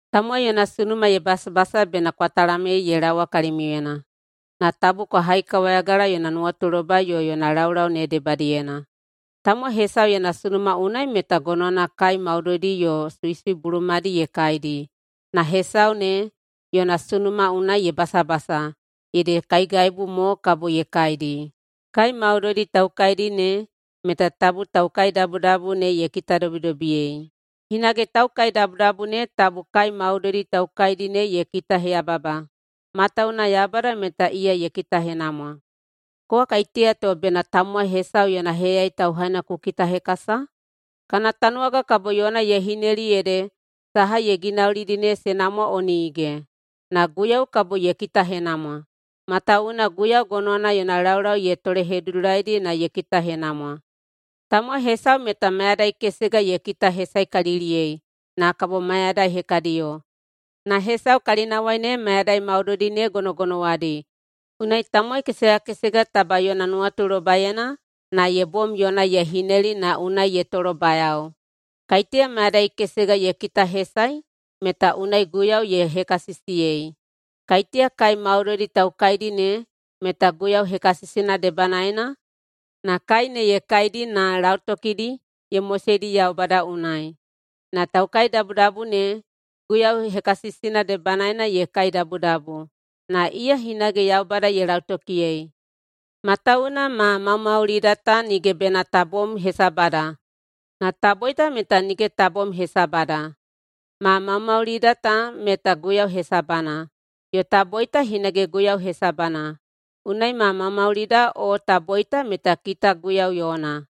Tamowai yona sunuma ye basabasa bena kwa talamyei ye laowa kalimiuyena, na tabu kwa haikawayagala yona nuwatulobai yo yona laulau ne debadiyena. Tamowai hesau yona sunuma unai meta gonowana kai maudoidi [yo suisui bulumadi] ye kaidi, na hesau ne yona sunuma unai ye basabasa, ede kaigaibu mo kabo ye kaidi. Kai maudoidi taukaidi ne meta tabu taukaidabudabu ne ye kitadobidobiyei. Hinage taukaidabudabu ne tabu kai maudoidi taukaidi ne ye kitaheyababa, matawuwuna Yaubada meta iya ye kitahenamwa. Kowa kaiteya to bena tamowai hesau yona heyayai tauhaina ku kitahekasa? Kana tanuwaga kabo yona ye hineli ede saha ye ginaulidi ne se namwa o nige. Na Guiyau kabo ye kitahenamwa, matawuwuna Guiyau gonowana yona laulau ye tolehedudulaidi na ye kitahenamwa. Tamowai hesau meta mayadai kesega ye kitahesaekaliliyei na kabo mayadai hekadiyo, na hesau kalinawai ne mayadai maudoidi ne gonogonowadi. Unai tamowai kesega kesega taba yona nuwatulobaiyena na ye bom yona ye hineli na unai ye tolobayao. Kaiteya mayadai kesega ye kitahesaei meta unai Guiyau ye hekasisiyei. Kaiteya kai maudoidi taukaidi ne meta Guiyau hekasisina debanaena na kai ne ye kaidi na lautokidi ye mosei Yaubada unai. Na taukaidabudabu ne Guiyau hekasisina debanaena ye kaidabudabu, na iya hinage Yaubada ye lautokiyei. Matawuwuna ma maumaulida ta nige bena ta bom hesabada, na ta boita meta nige ta bom hesabada. Ma maumaulida ta meta Guiyau hesabana, yo ta boita hinage Guiyau hesabana. Unai ma maumaulida o ta boita meta kita Guiyau yona.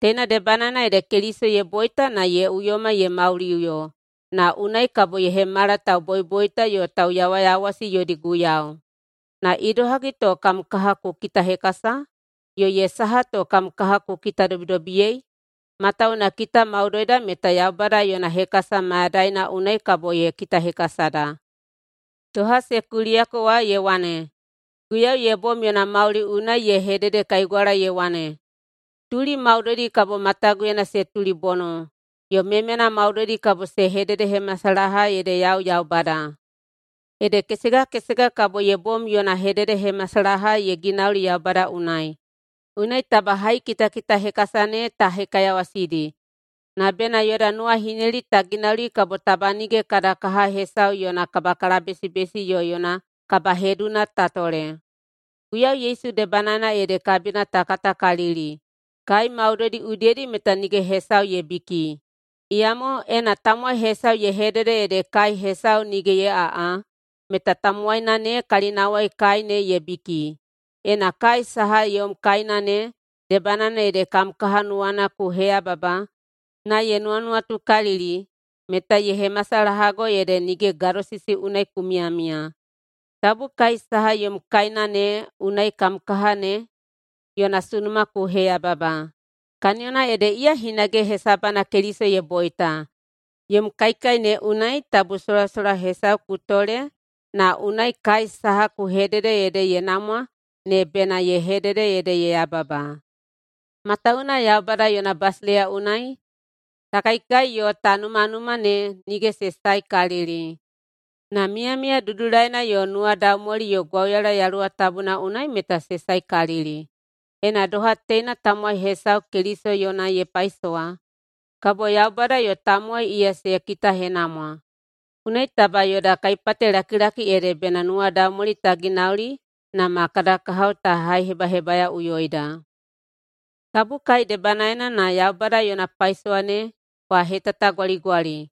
Teina debanaena ede Keliso ye boita na ye uyoma ye mauliꞌuyo, na unai kabo ye hemala tauboiboita yo tauyawayawasi yodi Guiyau. Na idohagi to kam kaha ku kitahekasa? Yo ye saha to kam kaha ku kitadobidobiyei? Matawuwuna kita maudoida meta Yaubada yona hekasa mayadaina unai kabo ye kitahekasada. Doha se kuliyako wa ye wane, “Guiyau ye bom yona mauli unai ye hededekaigwala ye wane, ‘Tuli maudoidi kabo mataguyena se tulibono, yo memena maudoidi kabo se hededehemasalaha ede yau Yaubada.’” Ede kesega kesega kabo ye bom yona hededehemasalaha ye ginauli Yaubada unai. Unai taba haikitakitahekasa ne ta hekaiyawasidi. Na bena yoda nuwahineli ta ginauli kabo taba nige kada kaha hesau yona kabakalabesibesi yo yona kabaheduna ta tole. Guiyau Yesu debanaena ede kabina ya katakalili kai maudoidi udiyedi meta nige hesau ye biki. Iyamo, ena tamowai hesau ye hedede ede kai hesau nige ye aꞌa, meta tamowaina ne kalinawai kai ne ye biki. Ena kai saha yom kaina ne debanaena ede kam kaha nuwana ku heyababa na ye nuwanuwatukalili, meta ye hemasalahago ede nige gadosisi unai ku miyamiya. Tabu kai saha yom kaina ne unai kam kaha ne yona sunuma ku heyababa, kaniyona ede iya hinage hesabana Keliso ye boita. Yom kaikai ne unai tabu solasola hesau ku tole na unai kai saha ku hedede ede ye namwa ne bena se hedede ede ye yababa. Matawuwuna Yaubada yona basileiya unai, ta kaikai yo ta numanuma ne nige se saekalili, na miyamiya dudulaina yo nuwadaumwali yo gwauyala Yaluwa Tabuna unai meta se saekalili. Ena doha teina tamowai hesau Keliso yona ye paisowa, kabo Yaubada yo tamowai iya se kitahenamwa. Unai taba yoda kaipatelakilaki ede bena nuwadaumwali ta ginauli na ma kada kahao ta haihebahebayaoꞌuyoida. Tabu kai debanaena na Yaubada yona paisowa ne kwa hetatagwaligwali.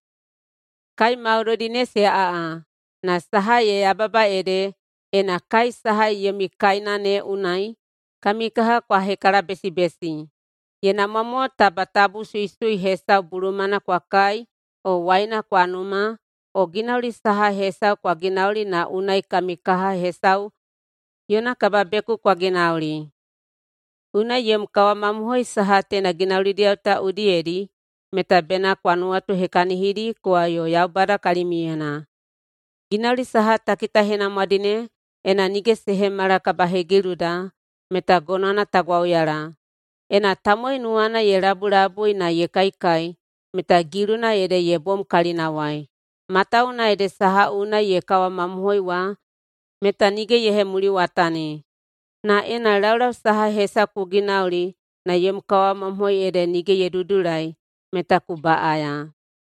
Kai maudoidi ne se aꞌa, na saha ye yababa ede ena kai saha yomi kaina ne unai kami kaha kwa hekalabesibesi. Ye namwa mo taba tabu suisui hesau bulumana kwa kai o waina kwa numa o ginauli saha hesau kwa ginauli na unai kami kaha hesau yona kababeku kwa ginauli. Unai yom kawamamohoi saha teina ginaulidiyao ta udiyedi meta bena ku nuwatuhekahinidi kowa yo Yaubada kalimiuyena. Ginauli saha ta kitahenamwadi ne, ena nige se hemala kabahegiluda, meta gonowana ta gwauyala. Ena tamowai nuwana ye labulabui na ye kaikai, meta giluna ede ye bom kalinawai, matawuwuna ede saha unai ye kawamamohoi wa meta nige ye hemuliwatani. Na ena laulau saha hesau ku ginauli na yom kawamamohoi ede nige ye dudulai, meta ku baꞌaya.